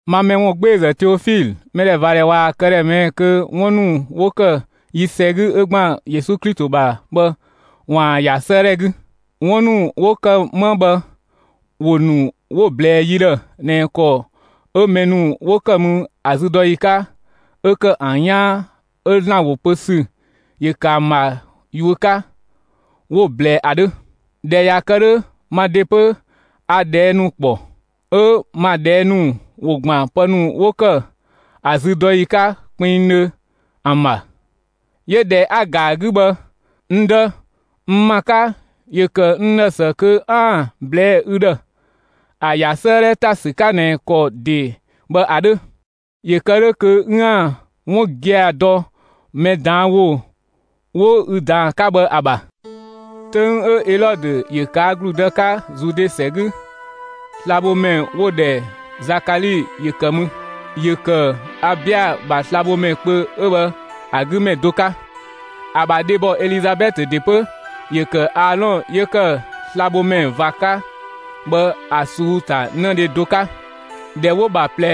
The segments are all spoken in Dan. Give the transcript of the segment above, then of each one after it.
Ma mɛ ‑wungbeezë Teofilö, mɛdhɛvadhɛ ꞊waa‑ këdhɛ ꞊mɛɛ'‑ kö 'wun ‑nu 'wo ‑kë yi ‑sɛ 'gü 'ö ‑gban Yesu Klito ‑bha bhë ‑waan ‑ya 'sëëdhɛ 'gü. 'Wun ‑nu 'wo ‑kë 'ma bhë ‑wo ‑nu 'wo‑ ꞊blɛɛ yi ‑dhë ꞊nɛ ‑kɔ 'ö mɛ ‑nu 'wo ‑kë mü ‑a züdɔyi 'ka, 'ö ‑kë ‑an 'yaan, 'ö ‑Zlan ‑wo pö ‑sü ‑yö ‑kë ‑an ‑bha yuö 'ka, 'wo‑ ꞊blɛɛ ‑a 'dhö. ꞊Dhɛ ꞊ya kë 'dhö, ma ‑de 'pö a ꞊dhɛɛ' ‑nu ‑kpɔ; 'ö ma ꞊dhɛɛ' ‑nu ‑wo ‑gban pë ‑nu 'wo ‑kë ‑a züdɔyi 'ka kpinngdhö ‑an ‑bha. 'Yö ꞊dhɛ 'a‑ ‑ga ‑a 'gü bhë, n dë, n ‑ma 'ka, ‑yö ‑kë n ‑dhë ‑së kö 'aan‑ ꞊blɛɛ'‑ ü ‑dhë, ‑a ‑ya 'sëëdhɛ ‑ta ‑sü 'ka ꞊nɛ ‑kɔ ‑de bhë ‑a 'dhö. ‑Yö ‑kë 'dhö kö 'üën‑ 'wun gia‑ dɔ mɛ ꞊daan' ‑wo 'wo ü ꞊daan 'ka bhë ‑a ‑bha. 'Töng 'ö Elɔdö ‑yö ꞊kaa' ‑gludë 'ka Zude ‑sɛ 'gü, slabhomɛ 'wo‑ ‑dhɛ Zakali ‑yö ‑kë mü, ‑yö ‑kë Abia ‑bha slabhomɛ kpö 'ö bhë ‑a 'gü ‑mɛ do 'ka. ‑A ‑bha dhebɔ Elizabɛtö ‑de 'pö ‑yö ‑kë Aalɔn 'yö ‑kë slabhomɛ ꞊va 'ka bhë ‑a ꞊suu'‑ ‑ta 'në dhe do 'ka. ꞊Dhɛ 'wo‑ ‑bha ꞊plɛ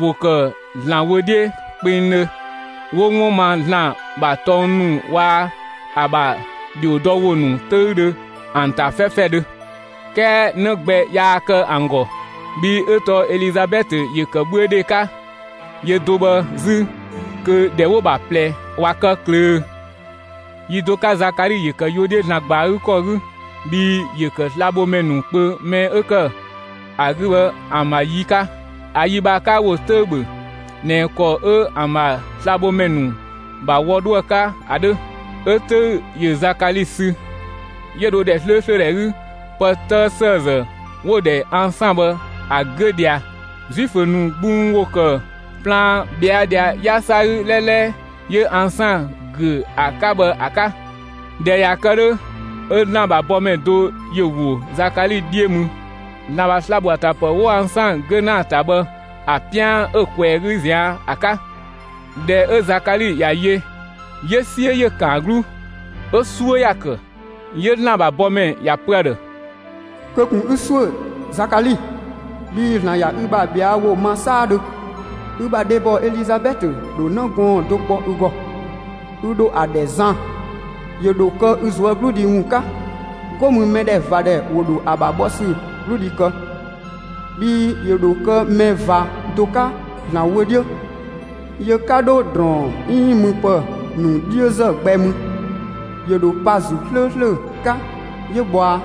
‑wo ‑kë ‑Zlan wö 'dhiö kpengdhö; 'wo 'wun ma ‑Zlan ‑bha tɔng ‑nu waa‑ ‑a ‑bha ‑dhiodɔwo ‑nu 'töüdhö ‑an ‑ta 'fɛfɛdhö. 'Kɛɛ 'në gbɛ yaa kë ‑an ‑gɔ, bhii 'ö tɔɔ Elizabɛtö ‑yö ‑kë 'bhüödhe 'ka; yö do bhë 'zü, kö ‑dhɛ 'wo‑ ‑bha ꞊plɛ ꞊wa kë ꞊klöö. Yi do 'ka Zakali ‑yö ‑kë yuö 'dhiö ‑Zlan ‑gba ‑a 'gü ‑kɔ 'gü, bhii ‑yö ‑kë slabhomɛ ‑nu kpö mɛ 'ö ‑kë ‑a 'gü bhë ‑an ‑bha yi 'ka. ‑A yi bhë ‑a 'ka ‑wo 'töü‑ ‑bhö ꞊nɛ ‑kɔ 'ö ‑an ‑bha slabhomɛ ‑nu ‑bha wɔ 'dho ‑a 'ka ‑a 'dhö. 'Ö 'töü‑ ‑yö Zakali sü, 'yö dho ‑dhɛ 'slööslö ‑dhɛ 'gü pë 'tëë ‑sëëzë 'wo‑ ‑dhɛ ansaan bhë ‑a 'güö ꞊dhia. Zuifö ‑nu gbung ‑wo ‑kë plaan ꞊bhɛa' ꞊dhia 'yasa 'gü 'lɛlɛ 'yö ansaan ‑güö ‑a 'ka bhë ‑a 'ka. ꞊Dhɛ ꞊ya kë 'dhö, 'ö ‑Zlan ‑bha bɔmɛ do ‑yö ‑wo Zakali 'dhiö mü, ‑Zlan ‑bha sla‑ ‑bho ‑a ‑ta ‑pë 'wo ansaan ‑güö ‑na ‑a ‑ta bhë ‑a 'pian 'ö ꞊kwɛɛ‑ 'gü ꞊zian' ‑a 'ka. ꞊Dhɛ 'ö Zakali ‑ya yö, 'yö 'siö ‑yö ‑kan ‑a 'gluu, 'ö 'suö ‑ya ‑kë. 'Yö ‑Zlan ‑bha bɔmɛ ‑ya ‑pö ‑a ‑dhë: «Kö ꞊kun 'ü ‑suö, Zakali, bhii ‑Zlan ꞊ya ü bha ꞊bhɛa' ‑wo ma 'saadhö, ü bha dhebɔ Elizabɛtö ‑dho 'në gɔɔn‑ do kpɔ ü ‑gɔ; ü ‑dho ‑a ‑dhɛ Zan. ‑Yö ‑dho kë ü ꞊zuögludhi ‑wun 'ka, 'go mü mɛdhɛvadhɛ ‑wo ‑dho ‑a ‑bha bhɔ ‑sü 'gludhi kë, bhii ‑yö ‑dho kë mɛ ꞊va do 'ka ‑Zlan wö 'dhiö. Yö 'ka 'dho ‑drɔɔn 'iin müpë ‑nu 'dhiözë gbɛ mü; ‑yö ‑dho pa ‑Zuu 'slööslö 'ka, 'yö bhɔa.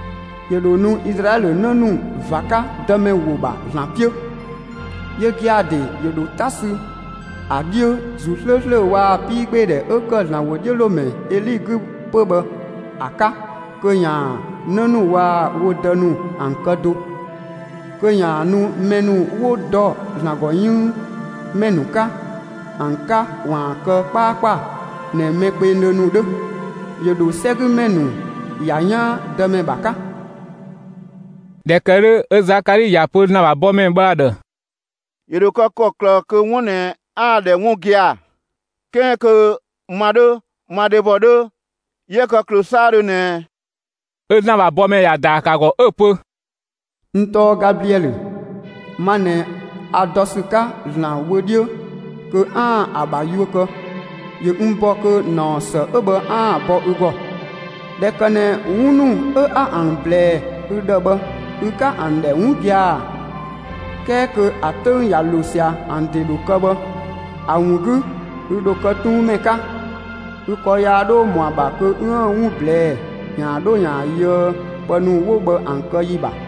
‑Yö ‑dho nu Izlaɛlö 'në ‑nu ꞊va 'ka Dëmɛ wo ‑bha ‑Zlan 'piö; yö gia‑ ‑de ‑yö ‑dho 'ta ‑sü ‑a 'dhiö ‑Zuu 'slööslö waa‑ 'piigbeedhɛ 'ö ‑kë ‑Zlan ‑wodhiölomɛ Eli 'gü 'pö bhë ‑a 'ka kö ‑yaan 'në ‑nu waa‑ wo dë ‑nu ‑an kë do, kö ‑yaan nu mɛ ‑nu 'wo dɔ ‑Zlan ‑gɔ 'yënng ‑mɛ 'ka ‑an 'ka ‑waan kë 'kpaakpa ꞊nɛ mɛ kpengdhö ‑nu 'dhö. ‑Yö ‑dho 'sɛgümɛ ‑nu ‑ya 'yaan Dëmɛ ‑bha 'ka.» ꞊Dhɛ ‑kë 'dhö, 'ö Zakali ‑ya ‑pö ‑Zlan ‑bha bɔmɛ bhë ‑a ‑dhë: «‑Yö ‑dho kë ‑kɔklë kö 'wun 'ö ꞊nɛ 'aan‑ ‑dhɛ 'wun gia‑, 'kɛɛ kö ma 'dhö, ma dhebɔ 'dhö 'yië kë ꞊klöö 'saadhö ꞊nɛ ꞊ɛ?» 'Ö ‑Zlan ‑bha bɔmɛ ‑ya ‑daa ‑kë ‑a ‑gɔ 'ö‑ pö: «N tɔɔ Gabliɛlö, ma ꞊nɛ a dɔ ‑sü 'ka ‑Zlan wö 'dhiö kö 'aan‑ ‑a ‑bha yuö kë; ‑yö n ‑bɔ kö ‑naɔ ‑së 'ö bhë 'aan‑ bɔ ü ‑gɔ. ꞊Dhɛ ‑kë ꞊nɛ 'wun ‑nu 'ö 'a ‑an ‑blɛɛ ü ‑dhë bhë, ü 'ka ‑an ‑dhɛ 'wun gia‑, 'kɛɛ kö ‑a 'töng ꞊ya ‑lo ꞊sia, ‑an ‑de ‑dho kë bhë, ‑a ‑wun 'gü ü ‑dho kë 'tuunmɛ 'ka; ü ‑kɔ yaa 'dho ‑mɔ ‑a ‑bha kö 'üën‑ 'wun ꞊blɛɛ'‑ ‑yaan 'dho ‑yaan yöë pë ‑nu 'wo bhë ‑an kë ‑yi ‑bha.»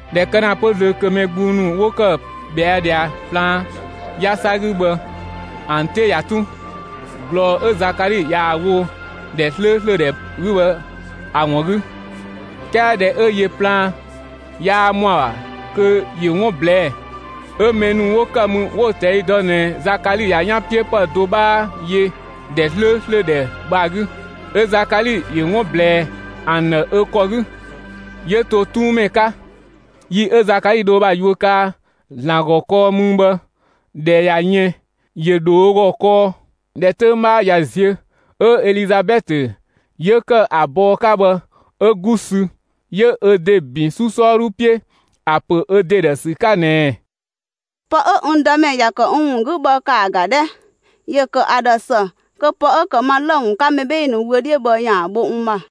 ꞊Dhɛ kë ‑na 'pö zlöö kö mɛ gbung ‑nu 'wo ‑kë ꞊bhɛa' ꞊dhia plaan 'yasa 'gü bhë ‑an 'te ꞊ya tun ꞊glɔɔ 'ö Zakali ꞊yaa‑ wo ‑dhɛ 'slööslö ‑dhɛ 'gü bhë ‑a ‑wun 'gü. 'Kɛɛ ꞊dhɛ 'ö yö plaan, yaa ‑mɔ ‑a ‑bha kö ‑yö 'wun ꞊blɛɛ'‑, 'ö mɛ ‑nu 'wo ‑kë mü 'wo‑ ꞊tɛi' dɔ ꞊nɛ Zakali ꞊ya 'yanpiöpë do 'bhaa yö ‑dhɛ 'slööslö ‑dhɛ bhë ‑a 'gü. 'Ö Zakali ‑yö 'wun ꞊blɛɛ ‑an ‑dhë ö ‑kɔ 'gü, 'yö to 'tuunmɛ 'ka. Yi 'ö Zakali dho ö bha yuö kaa ‑Zlan ‑gɔ kɔɔ mü bhë, ꞊dhɛ ꞊ya yën, ‑yö ‑dho ö ‑gɔ kɔɔ. ꞊Dhɛ 'töng 'bhaa ꞊ya ziö, 'ö Elizabɛtö 'yö ‑kë ‑a bɔɔ 'ka bhë, 'ö 'gu sü, 'yö ö ‑de ‑bin 'su 'sɔɔdhu 'piö, ‑a ‑pö ö ‑de ‑dhë ‑sü 'ka ꞊nɛɛ: «Pë 'ö n Dëmɛ ‑ya ‑kë n ‑wun 'gü bhë, ‑kaa ‑ga 'dhɛ: ‑Yö ‑kë ‑a ‑dhë ‑së kö pë 'ö ‑kë ma lë‑ ‑wun 'ka mɛ 'bhee‑ ‑nu wö 'dhiö bhë ‑yaan ‑a bho n ‑ma.»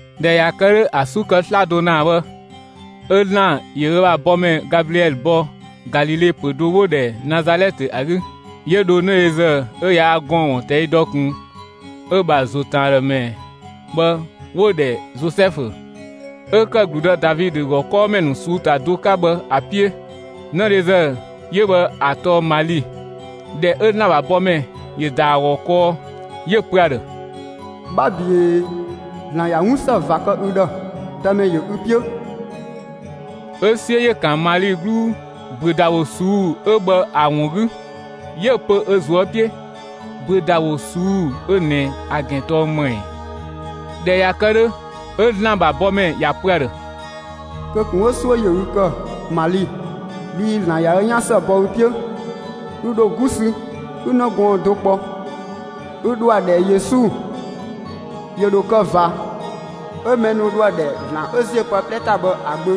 ꞊Dhɛ ꞊ya kë 'dhö ‑a 'su kë 'slado ‑naa bhë, 'ö ‑Zlan ‑yö ö bha bɔmɛ Gabliɛlö ‑bɔ Galile ‑pö do 'wo‑ ‑dhɛ Nazalɛtë ‑a 'gü. 'Yö dho 'nëdhezë 'ö yaa gɔɔn‑ ‑wun ꞊tɛi' dɔ ꞊kun, 'ö‑ ‑bha ‑zo ‑tën ‑a ‑dhë ‑mɛ bhë 'wo‑ ‑dhɛ Zozɛfu, 'ö ‑kë ‑gludë Davidö ‑gɔ 'kɔɔmɛ ‑nu ꞊suu'‑ ‑ta do 'ka bhë ‑a 'piö. 'Nëdhezë 'yö bhë ‑a tɔɔ Mali. ꞊Dhɛ 'ö ‑Zlan ‑bha bɔmɛ ‑yö ‑da ‑a ‑gɔ kɔɔ, 'yö‑ pö ‑a ‑dhë: «'Bha ꞊büee! ‑Zlan ꞊ya 'wun ‑së ꞊va kë ü ‑dhë! Dëmɛ ‑yö ü 'piö!» 'Ö 'siö ‑yö ‑kan Mali 'gluu ‑büödawo ꞊suu'‑ 'ö bhë ‑a ‑wun 'gü, 'yö‑ pö ö ꞊zuö' 'piö: «‑Büödawo ꞊suu'‑ 'ö ꞊nɛ ‑a ‑gɛn tɔɔ ‑më ‑ɛ?» ꞊Dhɛ ꞊ya kë 'dhö, 'ö ‑Zlan ‑bha bɔmɛ ‑ya ‑pö ‑a ‑dhë: «Kö ꞊kun 'ö 'suö ‑yö ü ‑kë, Mali, bhii ‑Zlan ꞊ya ö 'yan ‑së bɔ ü 'piö. Ü ‑dho 'gu sü, 'ü 'në gɔɔn‑ do kpɔ; 'ü ‑dho ‑a ‑dhɛ Yesu. ‑Yö ‑dho kë ꞊va, 'ö mɛ ‑nu dho ‑a ‑dhɛ ‑Zlan 'ö ‑ziö pë 'plɛ ‑ta bhë ‑a Gbö.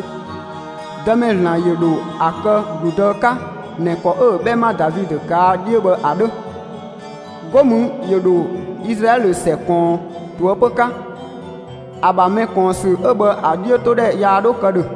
Dëmɛ ‑Zlan ‑yö ‑dho ‑a kë ‑gludë 'ka ꞊nɛ ‑kɔ 'ö‑ 'bhɛma Davidö ꞊kaa' 'dhiö bhë ‑a 'dhö. 'Go mü ‑yö ‑dho Izlaɛlö ‑sɛ ꞊kɔɔn ꞊toëpö 'ka; ‑a ‑bha mɛkɔɔnsü 'ö bhë, ‑a 'dhiötodhɛ yaa 'dho kë ‑dhö.»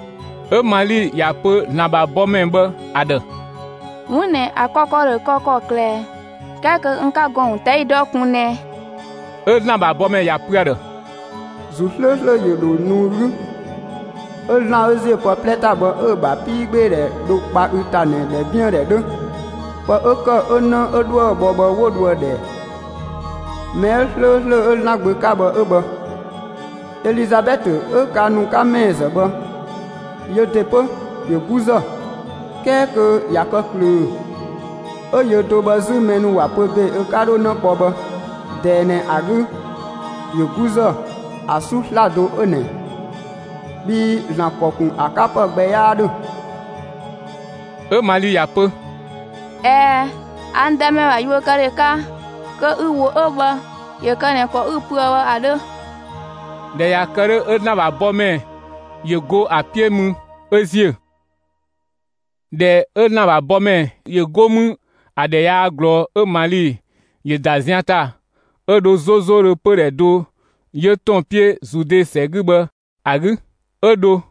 'Ö Mali ‑ya pö ‑Zlan ‑bha bɔmɛ bhë ‑a ‑dhë: «'Wun ꞊nɛ ‑a kë ‑kɔ ‑dho kë ‑kɔklë, 'kɛɛ kö n 'ka gɔɔn‑ ‑wun ꞊tɛi' dɔ ꞊kun ꞊nɛɛ?» 'Ö ‑Zlan ‑bha bɔmɛ ‑ya pö ‑a ‑dhë: «‑Zuu 'slööslö ‑yö ‑dho nu ü 'gü, 'ö ‑Zlan 'ö ‑ziö pë 'plɛ ‑ta bhë, 'ö‑ ‑bha 'piigbeedhɛ dho kpa ü ‑ta ꞊nɛ ‑dhɛbiëndhɛ 'dhö. Pë 'ö ‑kë 'ö 'në 'ö 'dhoë‑ bhɔ bhë 'wo dho ‑a ‑dhɛ: Mɛ 'ö 'slööslö 'yö ‑Zlan Gbö 'ka bhë 'ö bhë. Elizabɛtö 'ö ka ‑nu 'ka ‑mɛɛzë bhë, yö ‑de 'pö ‑yö 'guzë, 'kɛɛ kö ꞊ya kë ꞊klöö; 'ö yö do bhë 'zü, mɛ ‑nu ‑wa pö ‑be ö 'ka 'dho 'në kpɔ bhë, ꞊dɛɛ ꞊nɛ ‑a 'gü ‑yö 'guzë ‑a 'su 'slado 'ö ꞊nɛ. Bhii ‑Zlan ‑kɔ ‑kun ‑a 'ka ‑pë gbɛ 'yaa 'dhö.» 'Ö Mali ‑ya pö: «꞊Ɛɛ, a n Dëmɛ ‑bha yuökëdhe 'ka, kö ü ‑wo 'ö bhë ‑yö kë ꞊nɛ ‑kɔ 'ü‑ pöë bhë ‑a 'dhö!» ꞊Dhɛ ꞊ya kë 'dhö, 'ö ‑Zlan ‑bha bɔmɛ ‑yö go ‑a 'piö mü 'ö ‑ziö. ꞊Dhɛ 'ö ‑Zlan ‑bha bɔmɛ ‑yö go mü, ‑a ‑dhɛ yaa ꞊glɔɔ, 'ö Mali ‑yö ‑da zian ‑ta, 'ö dho 'zozodhö pödhɛ do 'yö ‑tɔn 'piö Zude ‑sɛ 'gü bhë ‑a 'gü. 'ö dho,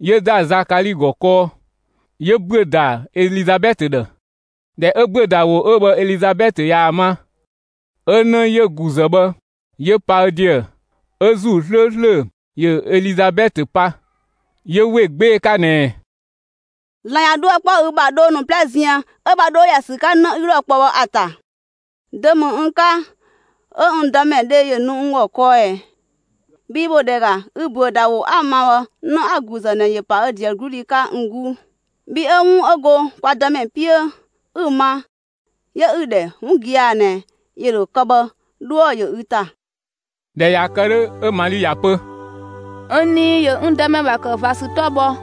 'yö ‑da Zakali ‑gɔ kɔɔ, 'yö ‑büö ‑da Elizabɛtö ‑dhë. ꞊Dhɛ 'ö ‑büödawo 'ö bhë Elizabɛtö ꞊yaa‑ ma, 'ö 'në 'yö‑ ‑guzë bhë, 'yö pa ö ‑deë. 'Ö ‑Zuu 'slööslö ‑yö Elizabɛtö pa, 'yö ‑we 'gbee‑ 'ka ꞊nɛɛ: «‑Zlan ꞊ya 'dhuë‑ 'kpɔ ü ‑bha, dhoo ‑nu 'plɛ ziën, 'ö‑ ‑bha 'dhuë‑ 'dho ‑ya ‑sü 'ka 'në 'ü 'dhoë‑ ‑a kpɔ bhë ‑a ‑ta! Dö ‑mü n 'ka 'ö n Dëmɛ dhe ‑yö nu n ‑gɔ kɔɔ ꞊ɛ? Bhii ‑bhö ‑dhɛ ‑ga, ü ‑büödawo 'a‑ ma bhë, 'në 'a‑ ‑guzë ꞊nɛ ‑yö ‑pa ö ‑deë 'gludhi 'ka n 'guu. Bhi 'ö 'wun 'ö go kwa Dëmɛ 'piö, 'ü‑ ma, 'yö 'ü‑ ‑dhɛ 'wun gia‑ ꞊nɛ, ‑yö ‑dho kë bhë, 'dhuë‑ ‑yö ü ‑ta!» ꞊Dhɛ ꞊ya kë 'dhö, 'ö Mali ‑ya pö: «N nii ‑yö n Dëmɛ ‑bha ‑kë ꞊va ‑sü 'tɔ bhɔ,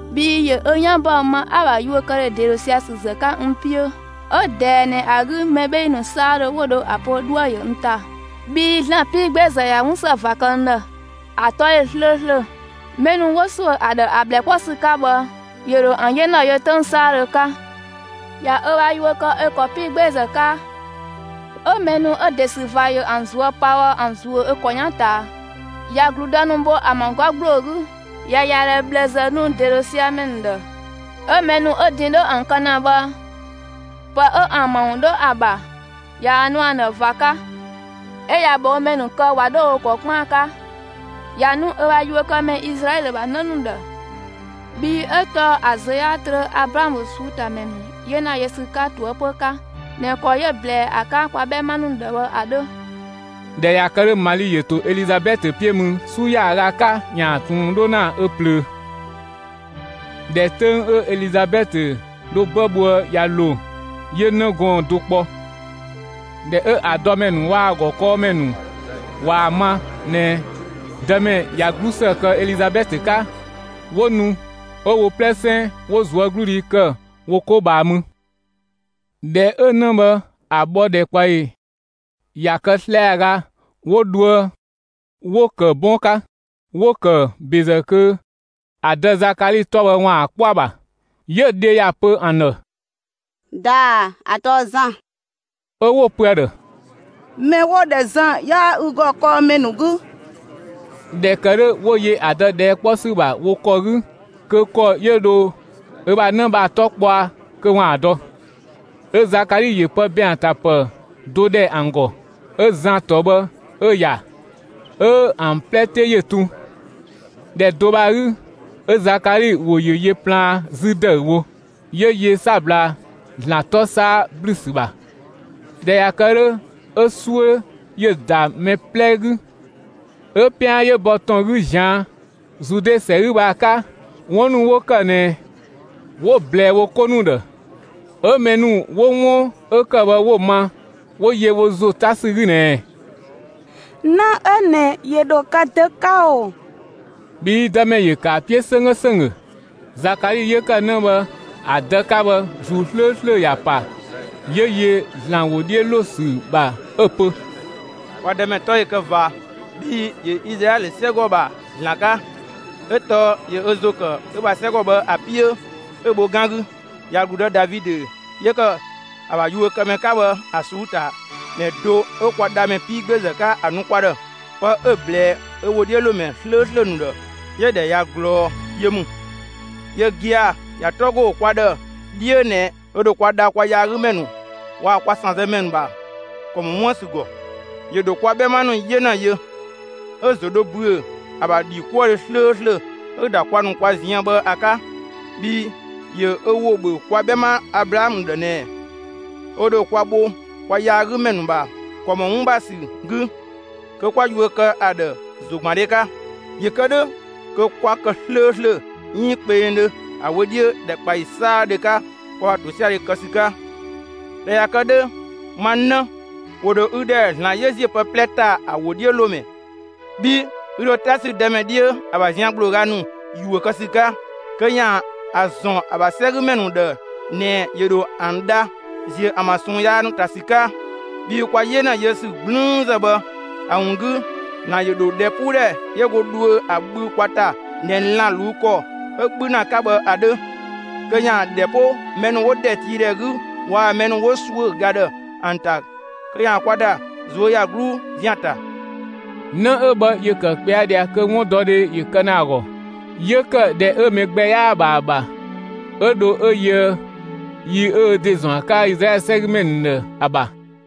Bhii ‑yö ö 'yan ‑bɔ ma 'a‑ ‑bha yuökëdhe ‑de ‑dho sia‑ ‑sü ‑zë 'ka n 'piö. 'Ö ꞊dɛɛ ꞊nɛ ‑a 'gü mɛ 'bhee‑ ‑nu 'saadhö 'wo dho ‑a pö 'dhuë‑ ‑yö n ‑ta, bhii ‑Zlan 'piigbeezë ꞊ya 'wun ‑së ꞊va kë n ‑dhë; ‑a 'tɔ ꞊yö 'slööslö! Mɛ ‑nu 'wo ‑suö ‑a ‑dhë ‑a ꞊bhlë 'kpɔ ‑sü 'ka bhë, ‑yö ‑dho ‑an 'yena yö 'töng 'saadhö 'ka. ꞊Ya ö bha yuö kë ö ‑kɔ 'piigbeezë 'ka, 'ö mɛ ‑nu 'ö ‑de ‑sü ꞊va ‑yö ‑an ꞊zuö' pa bhë ‑an ‑zuö ö ‑kɔ 'yan ꞊taa. ꞊Ya ‑gludë ‑nu bho ‑an ‑bha 'gɔ ‑gbloo 'gü, ꞊ya ‑yadhɛ ꞊bhlëzë nu ‑de ‑dho sia‑ ‑mɛ ‑nu ‑dhë. 'Ö mɛ ‑nu 'ö din 'dho ‑an kë ‑na bhë, pë 'ö ‑an ‑bha ‑wun 'dho ‑a ‑bha, ꞊yaa‑ nu ‑an ‑dhë ꞊va 'ka, 'ö ꞊ya ꞊bhɔɔmɛ ‑nu kë, ꞊wa 'dho wo ‑kɔ 'kpaan 'ka. ꞊Ya nu ö bha yuökëmɛ Izlaɛlö ‑bha 'në ‑nu ‑dhë, bhii 'ö tɔɔ ‑a ‑zlö 'yaa trö Ablaamö ꞊suu'‑ ‑ta ‑mɛ ‑nu 'yena yö ‑sü ‑wun 'ka ꞊toëpö 'ka ꞊nɛ ‑kɔ 'yö‑ ꞊blɛɛ ‑a 'ka kwa 'bhɛma ‑nu ‑dhë bhë ‑a 'dhö.» ꞊Dhɛ ꞊ya kë 'dhö, Mali ‑yö ‑to Elizabɛtö 'piö mü 'su ‑yaaga 'ka ‑yaan ꞊tun 'dho ‑na ö ꞊plöö. ꞊Dhɛ 'töng 'ö Elizabɛtö dho 'bë bhoë ꞊ya ‑lo, 'yö 'në gɔɔn‑ do kpɔ. ꞊Dhɛ 'ö ‑a dɔmɛ ‑nu waa‑ ‑a ‑gɔ 'kɔɔmɛ ‑nu ‑wa ma ꞊nɛ, Dëmɛ ꞊ya 'glusë kë Elizabɛtö 'ka, 'wo nu 'ö wo 'plɛsɛn 'wo ꞊zuögludhi ‑kë wo 'ko ꞊bhaa mü. ꞊Dhɛ 'ö 'në bhë ‑a bhɔ ‑dhɛkpaɔyi ꞊ya kë 'slɛaga, 'wo dhoë 'wo‑ ‑kë 'bɔn 'ka; 'wo‑ ‑kë ‑bezë kö ‑a dë Zakali 'tɔ bhë ‑waan ‑a 'kpɔ ‑a ‑bha. 'Yö‑ dhe ‑ya ‑pö ‑an ‑dhë: «‑Daa, ‑a tɔɔ Zan!» 'Ö 'wo‑ pö ‑a ‑dhë: «Mɛ 'wo‑ ‑dhɛ Zan 'yaa ü ‑gɔ 'kɔɔmɛ ‑nu 'gü!» ꞊Dhɛ ‑kë 'dhö, 'wo yö ‑a dë ꞊dhɛɛ' 'kpɔ ‑sü ‑bha wo ‑kɔ 'gü kö ‑kɔ 'yö dho ö bha 'në bhë ‑a 'tɔ kpɔa kö ‑waan ‑a dɔ. 'Ö Zakali ‑yö pë ‑bɛɛn ‑a ‑ta ‑pë do ‑dhɛ ‑an ‑gɔ, 'ö Zan ‑tɔ bhë 'ö‑ ‑ya. 'Ö ‑an 'plɛ 'te ‑yö tun. ‑Dhɛ do bhë ‑a 'gü, 'ö Zakali ‑wo ‑yö yö plaan 'zü ‑dëüwo; 'yö yö 'sabla ‑Zlan 'tɔ 'saa ‑blü ‑sü ‑bha. ꞊Dhɛ ꞊ya kë 'dhö, 'ö 'suö ‑yö ‑da mɛ 'plɛ 'gü, 'ö 'pian 'yö bɔ ‑tɔn 'gü ꞊zian' Zude ‑sɛ 'gü bhë ‑a 'ka, 'wun ‑nu 'wo ‑kë ꞊nɛ 'wo‑ ꞊blɛɛ wo 'ko ‑nu ‑dhë. 'Ö mɛ ‑nu 'wo 'wun 'ö ‑kë bhë 'wo‑ ma, 'wo yö wo ‑zo 'ta ‑sü 'gü ꞊nɛɛ: «'Në 'ö ꞊nɛ ‑yö ‑dho kë dö 'ka ‑o?» Bhii Dëmɛ ‑yö ‑kë ‑a 'piö 'sönggö ‑sönggö. Zakali 'yö ‑kë 'në bhë ‑a dë 'ka bhë, ‑Zuu 'slööslö ‑ya pa, 'yö yö ‑Zlan ‑wo 'dhiö ‑lo ‑sü ‑bha 'ö‑ pö: «Kwa Dëmɛ 'tɔ ‑yö kë ꞊va, bhi ‑yö Izlaɛlö 'sɛgɔ ‑bha ‑Zlan 'ka! 'ö tɔɔ ‑yö ö ‑zo ‑kë ö bha 'sɛgɔ bhë ‑a 'piö, 'ö‑ bho 'gan 'gü. ꞊Ya ‑gludë Davidö 'yö ‑kë ‑a ‑bha yuökëmɛ 'ka bhë, ‑a ꞊suu'‑ ‑ta ‑mɛ do 'ö kwa Dhamɛ 'piigbeezë 'ka, ‑a nu kwa ‑dhë. Pë 'ö‑ ꞊blɛɛ ö ‑wodhiölomɛ 'slööslö ‑nu ‑dhë, 'yö‑ ‑dhɛ ꞊ya ꞊glɔɔ yö ‑mü. Yö gia‑ ‑ya 'tɔ ‑go kwa ‑dhë 'dhiö ꞊nɛ ö ‑dho kwa dha kwa yaagümɛ ‑nu waa‑ kwa ‑sanzëmɛ ‑nu ‑bha ‑kɔ ‑mɔ 'wuën‑ ‑sü ‑gɔ. ‑Yö ‑dho kwa 'bhɛma ‑nu 'yena yö, 'ö‑ ‑zo dho ‑büö ‑a ‑bha ‑dhikuëdhe 'slööslö 'ö‑ ‑da kwa ‑nu kwa ziën bhë ‑a 'ka. Bhii ‑yö ö ‑wo ‑bhö kwa 'bhɛma Ablaamö ‑dhë ꞊nɛ, ö ‑dho kwa bho kwa yaagümɛ ‑nu ‑bha ‑kɔ ‑mɔ 'wun ‑bha ‑sü 'gü, kö 'kwa yuö kë ‑a ‑dhë ‑zogbandhe 'ka. ‑Yö kë 'dhö kö 'kwa kë 'slööslö 'iin kpengdhö ‑a wö 'dhiö ‑dhɛkpaɔyi 'saadhö 'ka, kwa ‑bha ‑tosiadhe kë ‑sü 'ka. ꞊Dhɛ ꞊ya kë 'dhö, ma 'në, ‑wo ‑dho ü ‑dhɛ ‑Zlan 'yö ‑ziö pë 'plɛ ‑ta ‑a ‑wodhiölomɛ, bhii ü ‑dho 'ta sü Dëmɛ 'dhiö, ‑a ‑bha zian ‑gblooga ‑nu ‑yuö kë ‑sü 'ka, kö ‑yaan ‑a ‑zɔn ‑a ‑bha 'sɛgümɛ ‑nu ‑dhë ꞊nɛ ‑yö ‑dho ‑an dha, ‑ziö ‑an ‑bha ꞊sɔɔn yaa ‑nu ‑ta ‑sü 'ka. Bhii kwa 'yena yö ‑sü 'gblüünzë bhë ‑a ‑wun 'gü, ‑Zlan ‑yö ‑dho ‑dhɛpuudhɛ 'yö go dhuö ‑a bhü kwa ‑ta ꞊nɛ lan‑ ꞊luu' ‑kɔ 'ö 'bhü ‑na 'ka bhë ‑a 'dhö kö ‑yaan ‑dhɛ 'po mɛ ‑nu 'wo ‑dhɛtiidhɛ 'gü waa‑ mɛ ‑nu 'wo ‑suö ga ‑dhë ‑an ‑ta, kö ‑yaan kwa ‑da ꞊zuöyagluu ‑zian ‑ta.» 'Në 'ö bhë ‑yö ‑kë ꞊kpɛa' ꞊dhia kö 'wundɔdhe ‑yö kë ‑na ‑a ‑gɔ; 'yö ‑kë ‑dhɛ 'ö mɛ gbɛ 'yaa‑ ‑bha ‑a ‑bha 'ö dho 'ö yöë yi 'yö ö ‑de ‑zɔn ‑a 'ka Izlaɛlö ‑sɛgümɛ ‑nu ‑dhë ‑a ‑bha.